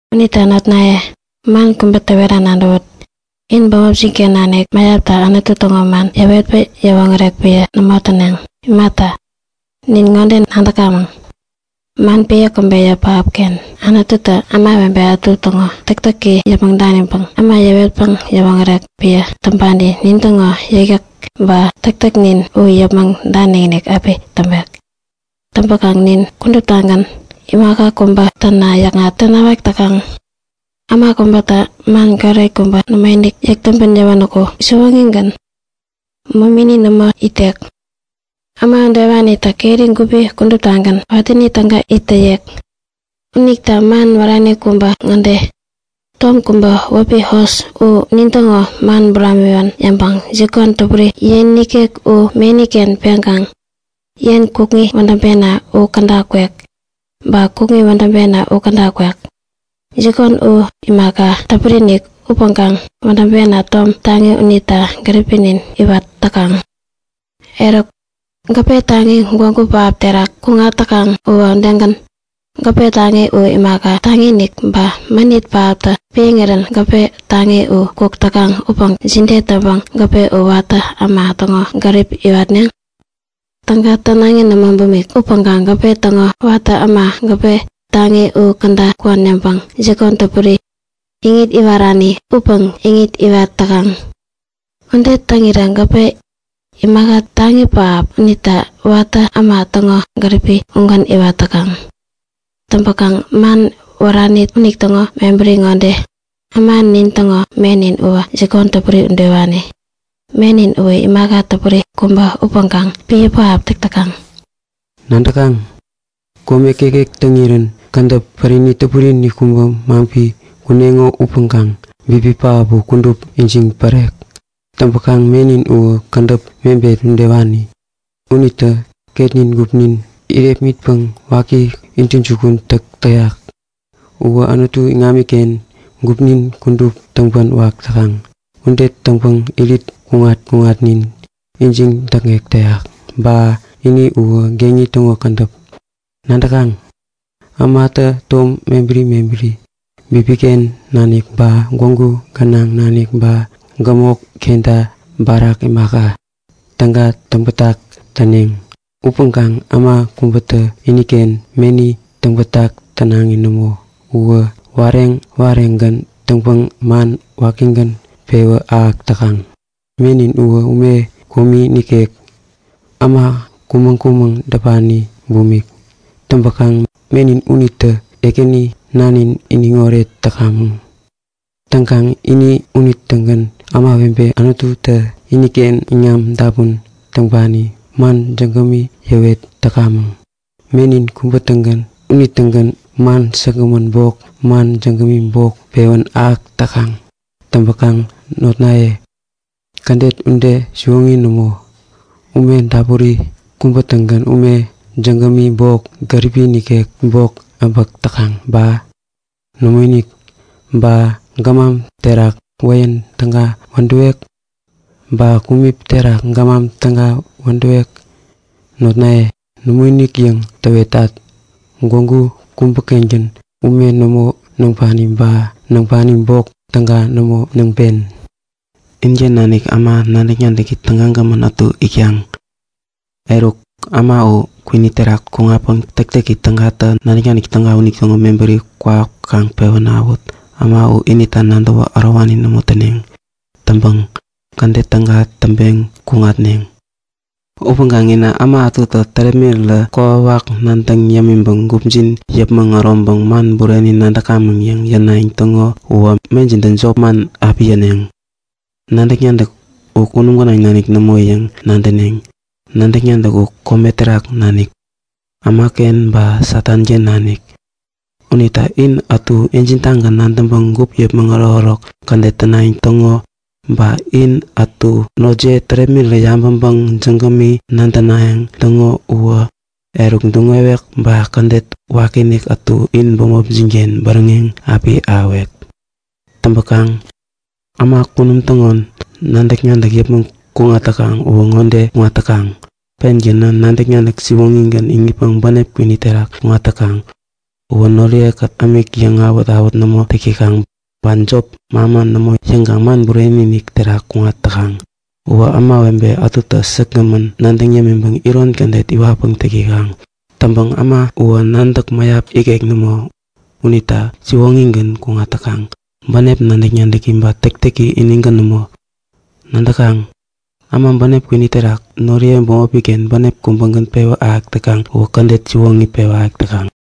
Unita notnaye, man kubä täwera nadäwut; In bämopjin-ken nanik mäyaptä Anutu täŋo man yäwetpäŋ yäwoŋärek piä nämo yäpneŋ. Imata, nin ŋode nadäkamäŋ; Man piä käbeyä pähapken Anututä ämawebe ätu täŋo täktäki yäpmäŋ daniŋpäŋ äma yäwetpäŋ yäwoŋärek piä täŋpani nintäŋo yäkyäk ba täktäknin u yäpmäŋ danikinik api täŋpek. Täŋpäkaŋ nin kuduptagän imaka kubä täna yäkŋat tänawak täkaŋ. Äma kubätä man goret kubä nämoinik yäk täŋpän yäwänäku siwoŋigän, momini nämo itek. Äma udewanitä keri gupi kuduptagän watäni täga it täyek. Unita man wärani kubä ŋode; Tom kubä wäpi hos u nintäŋo man buramiwän yäŋpäŋä jikon täpuri yen nikek u meni-ken peŋkaŋ, yen kukŋi wädäŋpena u käda kwek. Ba kukŋi wädäŋpena u käda kwek. Jikon u imaka täpuri-inik upäŋkaŋ wädäŋpena tom taŋi unitä gäripnin iwat täkaŋ. Eruk, gäpe taŋi gwägu pähap terak kuŋat täkaŋ uwä udegän. Gäpe taŋi u imaka taŋi-inik, ba mänit pähaptä piäŋirän gäpe taŋi u kuk täkaŋ upäŋ jide täŋpäŋ gäpe u watä äma täŋo gärip iwarek? Täga tänaŋi nämo bumik upäŋkaŋ gäpe täŋo watä ämatä gäpe taŋi u käda kwän yäŋpäŋ jikon täpuri, iŋit iwarani upäŋ iŋit iwat täkaŋ. Ude täŋirä gäpe, imaka taŋi pähap unitä watä äma täŋo gärip ugän iwat täkaŋ. Täŋpäkaŋ man wärani unitäŋo mebäri ŋode; Äma nin täŋo menin uwä jikon täpuri udewani. Menin uwä imaka täpuri kubä upäŋkaŋ piä pähap täk täkaŋ. Nadäkaŋ? Kome kekek täŋirän kädäp pärini täpuri-inik kubä maŋpi kuneŋo upäŋkaŋ bipi pähap u kudup ijiŋ pärek. Täŋpäkaŋ menin uwä kädäp mebet udewani. Unitä ketnin gupnin irepmitpäŋ waki intäjukun täk täyak. Uwä Anutu iŋamiken gupnin kudup täŋpän wak täkaŋ. Ude täŋpäŋ irit kuŋat-kuŋatnin ijiŋ däkŋek täyak. Ba ini uwä geŋi täŋo kädäp. Nadäkaŋ? Ämatä tom mebäri mebäri, bipiken nanik ba gwägu gänaŋ nanik ba gämok kenta barak imaka, täga täŋbätak täneŋ. Upäŋkaŋ äma kubätä iniken meni täŋbätak tänaŋi nämo. Uwä wareŋ-wareŋgän täŋpäŋ man wakigän pewä ahäk täkaŋ. Menin uwä ume komi nikek, äma kumäŋ-kumäŋ däpani bumik. Täŋpäkaŋ menin unitä Ekäni Nanin iniŋoret täkamäŋ. Täŋkaŋ ini unitägän ämawebe Anututä iniken iŋam dapun täŋpani man jägämi yäwet täkamäŋ. Menin kubägän unitägän man säkgämän bok man jägämi bok pewän ahäk täkaŋ. Täŋpäkaŋ notnaye, kädet ude siwoŋi nämo. Ume dapuri kubä-tägän ume jägämi bok gäripi nikek bok äbäk täkaŋ ba? Nämoinik! Ba gämam terak wäyän täga wädäwek? Ba kumip terak gämam täga wädäwek? Notnaye, nämoinik yäŋ täwetat. Gwägu kubä-kengän ume nämo näŋpani ba näŋpani bok täga nämo näŋpen. Inken nanik äma nadäk-nadäki tägagämän ätu itkaŋ? Eruk, äma u kwini terak kuŋatpäŋ täktäki tägatä nadäk-nadäki täga unitäŋo mebäri kwawak kaŋ pewä ahäwut. Äma u inita nadäwä ärowani nämo täneŋ. Täŋpäŋ kädet täga täŋpeŋ kuŋatneŋ. Upäŋkaŋ inä äma ätutä tärepmirirä kokwawak nadäŋ yämiŋpäŋ gupjin yäpmäŋ äroŋpäŋ man bureni nadäkamäŋ yäŋ yänayäŋ täŋo uwä mejintä jopman api yäneŋ. Nadäk-nadäk u kunum gänaŋ nanik nämo yäŋ nadäneŋ. Nadäk-nadäk u kome terak nanik, ämaken ba Satanken nanik. Unita in ätutä injin-tagän nadäŋpäŋ gup yäpmäŋ ärokärok kädet tänayäŋ täŋo, ba in ätutä notjiye tärepmirirä tabäŋpäŋ jägämi nadänayäŋ täŋo uwä, eruk duŋwek ba kädet wakiinik ätu in bämopjin-ken bäräŋeŋ api ahäwek. Täŋpäkaŋ äma kunum täŋo nadäk-nadäk yäpmäŋ kuŋat täkaŋ uwä ŋode kuŋat täkaŋ; Pengänä nadäk-nadäk siwoŋigän iŋitpäŋ bänep kwini terak kuŋat täkaŋ. Uwä noriye-kät ämik yäŋawät-awät nämo täk täkaŋ. Ba jop manman nämo yäŋkaŋ man buramik terak kuŋat täkaŋ. Uwä ämawebe ätuta säkgämän nadäŋ yämiŋpäŋ iron kädet iwatpäŋ täk täkaŋ. Täŋpäŋ äma uwä nadäk mäyap ikek nämo. Unitä siwoŋigän kuŋat täkaŋ, bänep nadäk-nadäki ba täktäki inigän nämo. Nadäkaŋ? Äma bänep kwini terak noriye bämopi-ken bänep kubägän pewä ahäk täkaŋ uwä kädet siwoŋi pewä ahäk täkaŋ.